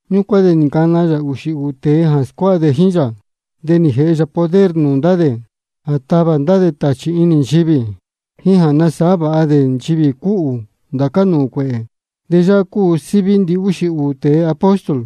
Ñúcuán de nī ncana yā ūxī ūū tēe jā scuáha dē jíín yā. De nī jēhe yā poder nūū ndá dē jā tavā dē ndá tāchī inī nchivī, jíín jā nasāhá vāha dē nchivī cúhū ndācá nūū cuēhē. De yáhá cúu síví ndihúxī ūū tēe apóstol: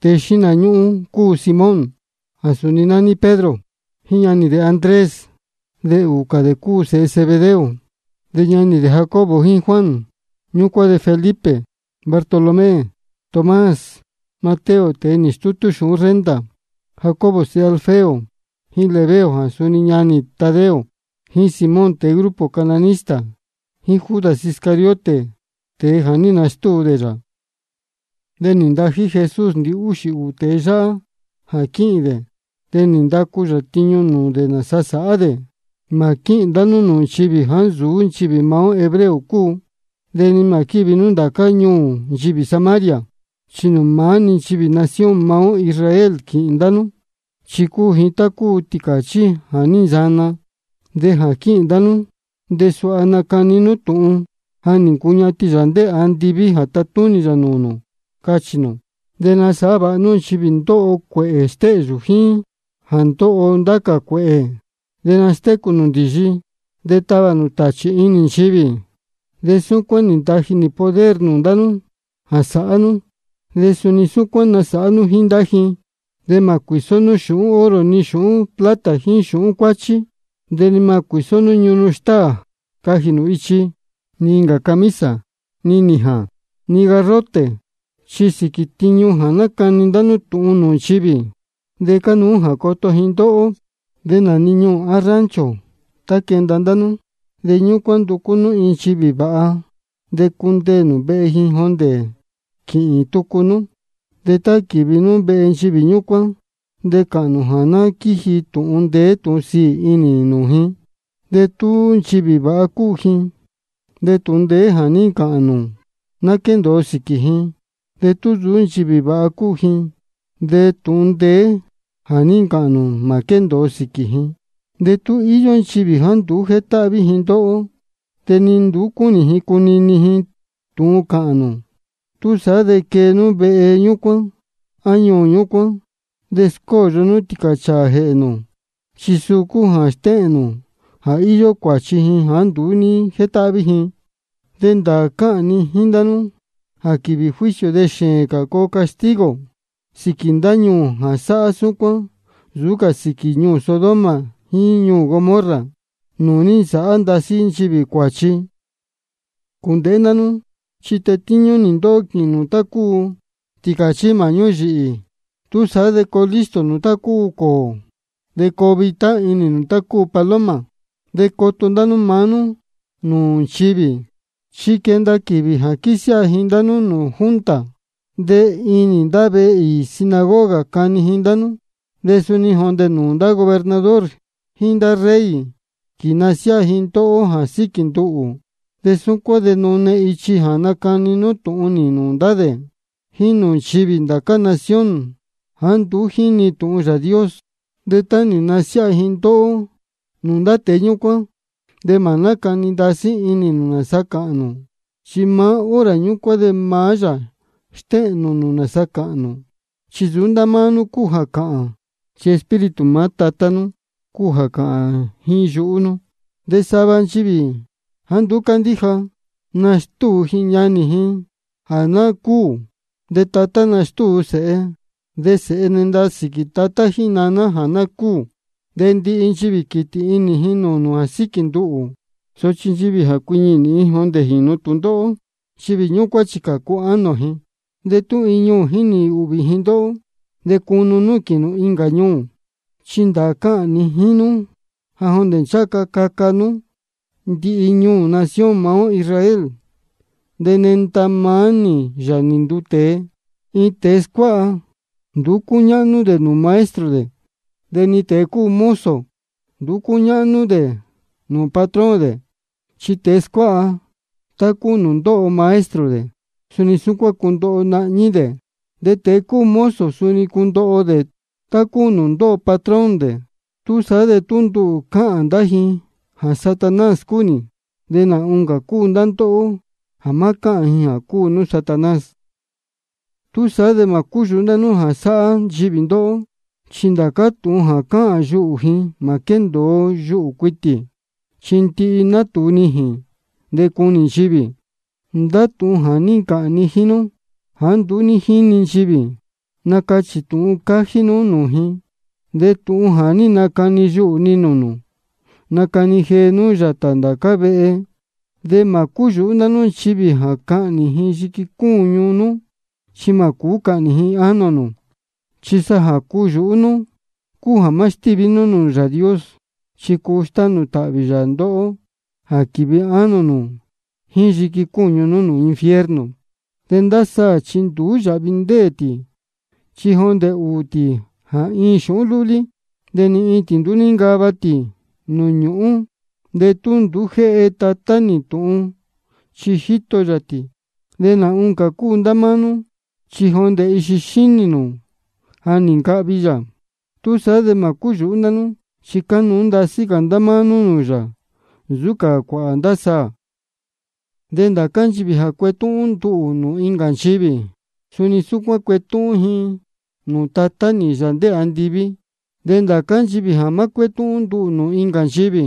Tēe xíhna ñúhún cúu Simón jā suni nání Pedro, jíín ñanī dē Andrés. De ūū cā dē cúu sēhe Zebedeo, de nání dē Jacobo jíín Juan. Ñúcuán de Felipe, Bartolomé, Tomás, Mateo tēe nī stútú xūhún renta, Jacobo sēhe Alfeo, jíín Lebeo jā suni nání Tadeo, jíín Simón tēe grupo cananista, jíín Judas Iscariote, tēe jā ní nastúu dē yā. De nī ntají Jesús ndihúxī ūū tēe yáhá jā quíhīn dē. De nī ndacu yā tiñu nūū dē nāsa sāhá dē: Mā quíhīn ndá nú nūū nchivī jāá nsuú nchivī maá ó hebreo cúu, de ni mā quívi nú ndācá ñuū nchivī Samaria. Chi nūū maá-ni nchivī nación maá ó Israel quīhīn ndá nú, chi cúu ji tá cúu tīcāchí jā ní nsana. De jā quíhīn ndá nú de suha nacani nú tūhun: Ja nī ncuñatin Yāā ndéē andiví jā tatúnī yā nūū nū, cachī nū. De nasāhá vāha nú nchivī ndóho cuēhē stéhyū jíín jā ndóho ndá cā cuēhē, de nastécū nū ndīyi, de tavā nū tāchī inī nchivī. De súcuán-ni nī ntaji nī poder nūū ndá nú jā sāhá nú, de suni súcuán-ni nasāhá nú jíín ndá ji. De mā cuīsó nú xūhún oro ni xūhún plata ni xūhún cuáchí. De ni mā cuīsó nú ñunu stáā cajī nū ichi, ni incā camisa, ni nījān, ni garrote. Chi sīquī tiñu jā nácani ndá nú tūhun nūū nchivī, de cánuú jā coto ji ndóhó. De nā-ni ñuū á rancho tá quenda ndá nú, de ñúcuán nducú nú iin nchivī vāha, de cundeē nū vehe ji jondē quīhīn tucu nú. De tá quīvi nú vehe nchivī ñúcuán, de cāhān nū jā ná quíji tūhun ndeé tūhun sīī inī nūū ji. De tú nchivī vāha cúu ji, de tūhun ndeé jā ní ncāhān nū ná quéndōo sīquī ji. De tú nsūú nchivī vāha cúu ji, de tūhun ndeé jā ní ncāhān nū mā quéndōo sīquī ji. De tú íyó nchivī jāá nduú jétáhví ji ndóhó, de ni nduú cúnī ji cunini ji tūhun cáhān nū, túsaá de quee nú vehe ñúcuán á ñuū ñúcuán, de scóyo nú tīcāchāā jēhē nū, chi suu cúu jā stéhēn nū jā íyó cuāchi ji jāá nduú ní jétáhví ji. De ndāā cáhān ni jíín ndá nú jā quīvī juicio de xēēn cā coo castigo sīquī ndá ñuū jā sáhá súcuán nsūú cā sīquī ñuū Sodoma jíín ñuū Gomorra nūū ní nsāhá ndasí nchivī cuāchi. Cūndēhé ndá nú, chi tetíñú nī ndóhó quīhīn nū tá cúu tīcāchí māhñú yīhī. Túsaá de coo listo nū tá cúu cōō, de coo vitá inī nū tá cúu paloma. De coto ndá nú maá nú nūū nchivī, chi quenda quīvī jā quīsiáha ji ndá nú nūū junta, de inī ndá vehe īī sinagoga cani ji ndá nú. De suni jondē nūū ndá gobernador jíín ndá rey quīnasiáha ji ndóhó jā síquī nduhū. De súcuán de nune ichi jā nacani nú tūhun nī nūū ndá dē jíín nūū nchivī ndācá nación jāá nduú jínī tūhun Yāā Dios. De tá nī nsiáha ji ndóhó nūū ndá tēe ñúcuán, de mā nácani ndasí inī nū nāsa cāhān nū. Chi maá hora ñúcuán de maá yā stéhēn nūū nū nāsa cāhān nū. Chi nsūú ndá máá nú cúu jā cāhān, chi Espíritu maá Tatá nú cúu jā cāhān jíín yuhú nú. De sava nchivī jāá nduú cándíja, nastúu ji ñanī ji jā ná cúū. De tatá nastúu sēhe. De sēhe nenda sīquī tatá jíín naná jā ná cúū. De ndihi nchivī quītī inī ji nūū nū jā síquī nduhū. Sochi nchivī jā cuiñi nīhin jondē jīnu tūndóhó, nchivī ñúcuán chi cācu ánō ji. De tú iin ñuū jínī ūhvī ji ndóhó, de cunu nú quīhīn nū incā ñuū. Chi ndāā cáhān ni jíín nú jā jondē ncháha ca caca nuu nú ndihi ñuū nación maá ó Israel, de nenda-ni maá nī, Yāā nī nduu tēe. Iin tēe scuáha, nduú cúñáhnú cā dē nsūú maestro dē. De ni tēe cúu mozo, nduú cúñáhnú cā dē nsūú patrón dē. Chi tēe scuáha, tá cúu nūū ndóho maestro dē, suni súcuán cundoho nahñí dē, de tēe cúu mozo suni cundoho dē tá cúu nūū ndóho patrón dē. Túsaá de tú nduhū cáhān ndá ji jā Satanás cúu nī, de nā oncā cúu ndá ndóhó jā má cáhān ji jā cúu nú Satanás. Túsaá de mā cúyūhú ndá nú jā sāhá nchivī ndóhó. Chi ndācá tūhun jā cáhān yuhū ji mā quéndōo yuhū cuitī, chi ndihi natūu nijīn, de cunī nchivī. Ndá tūhun jā ní ncāhān ni jíín nú jāá nduú ní jínī nchivī, nacachī tūhun cájí nú nūū ji. De tūhun jā ní nacani yuhū ni nūū nū, nacani jee nú yātā ndācá vehe. De mā cúyūhú ndá nú nchivī jā cahnī ji yiqui cúñu nú, chi mā cūú cahnī ji ánō nū. Chi sa jā cuyūhú nú cúu jā má stíví nú nūū Yāā Dios, chi cuu stánū tāhvī yā ndóhó jā quīvi ánō nū jíín yiqui cúñu nú infierno. De ndá saā chi nduú yāhvi ndéē tī, chi jondē ūū tī jā iin xūhún lúlí. De ni iin tī nduú níncava tī nūū ñūhún de tú nduú jéhe Tatá nú tūhun, chi jíto yā tī. De nā oncā cúu ndá máá nú, chi jondē ndihi ixi xínī nū ja nī ncahvi yā. Túsaá de mā cúyūhú ndá nú, chi cánuú ndasí cā ndá máá nú nūū yā nsūú cā cuāhā ndá saā. De ndācá nchivī jā cuetúhún nduhū nūū incā nchivī, suni súcuán cuetúhún nī ji nūū Tatá nī, Yāā ndéē andiví. De ndācá nchivī jā má cuétúhún nduhū nūū incā nchivī,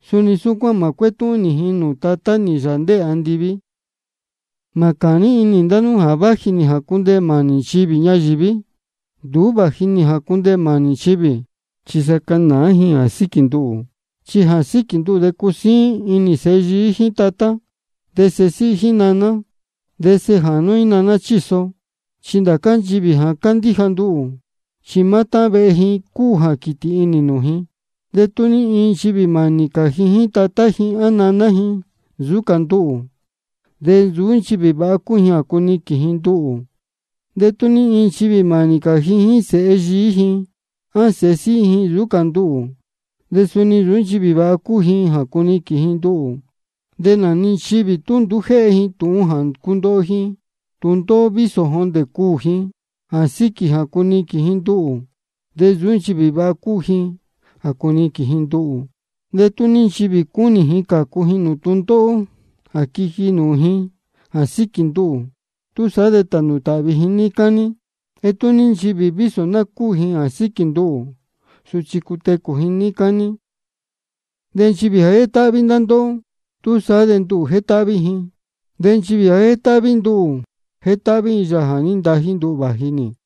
suni súcuán mā cuétúhún nī ji nūū Tatá nī, Yāā ndéē andiví. Mā cāní inī ndá nú jā váji nī jā cundeē mānī nchivī ñayīví. Nduú vāji nī jā cundeē mānī nchivī, chi sa canāá ji jā síquī nduhū. Chi jā síquī nduhū de cusíín inī sēhe yií jíín tatá, de sēhe síhí jíín naná, de sēhe jānú jíín naná chíso. Chi ndācá nchivī jā candíja nduhū, chi maá táhán vehe ji cúu jā quītī inī nūū ji. De tú ní iin nchivī mānī cā ji jíín tatá ji á naná ji nsūú cā nduhū, de nsūú nchivī vāha cúu ji jā cuniquīn ji nduhū. De tú ní iin nchivī mānī cā ji jíín sēhe yií ji á sēhe síhí ji nsūú cā nduhū, de suni nsūú nchivī vāha cúu ji jā cuniquīn ji nduhū. De nā-ni nchivī tú nduú jéhe ji tūhun jā cundoho ji tūndóhó vísō jondē cuū ji jā síquī jā cuniquīn ji nduhū, de nsūú nchivī vāha cúu ji jā cuniquīn ji nduhū. De tú ní nchivī cúnī ji cācu ji nūū tūndóhó jā quiji nūū ji jā síquī nduhū, túsaá de tānū tāhvī ji níí cání. De tú ní nchivī vísō ná cúū ji jā síquī nduhū, sochi cutecū ji níí cání. De nchivī jā jétáhví ndá ndóhó, túsaá de nduhū jétáhví ji. De nchivī jā jétáhví nduhū, jétáhví ji Yāā jā ní ntají nduhū vāji nī.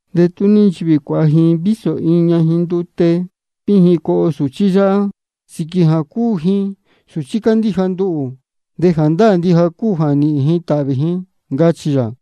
De tú ní nchivī cuāha ji vísō iin ñajin ndute víjin coho iin sūchí yáhá, sīquī jā cúu ji sūchí cándíja nduhū, de jāndáā ndija cúu jā nīhīn ji tāhvī ji, ncachī yā.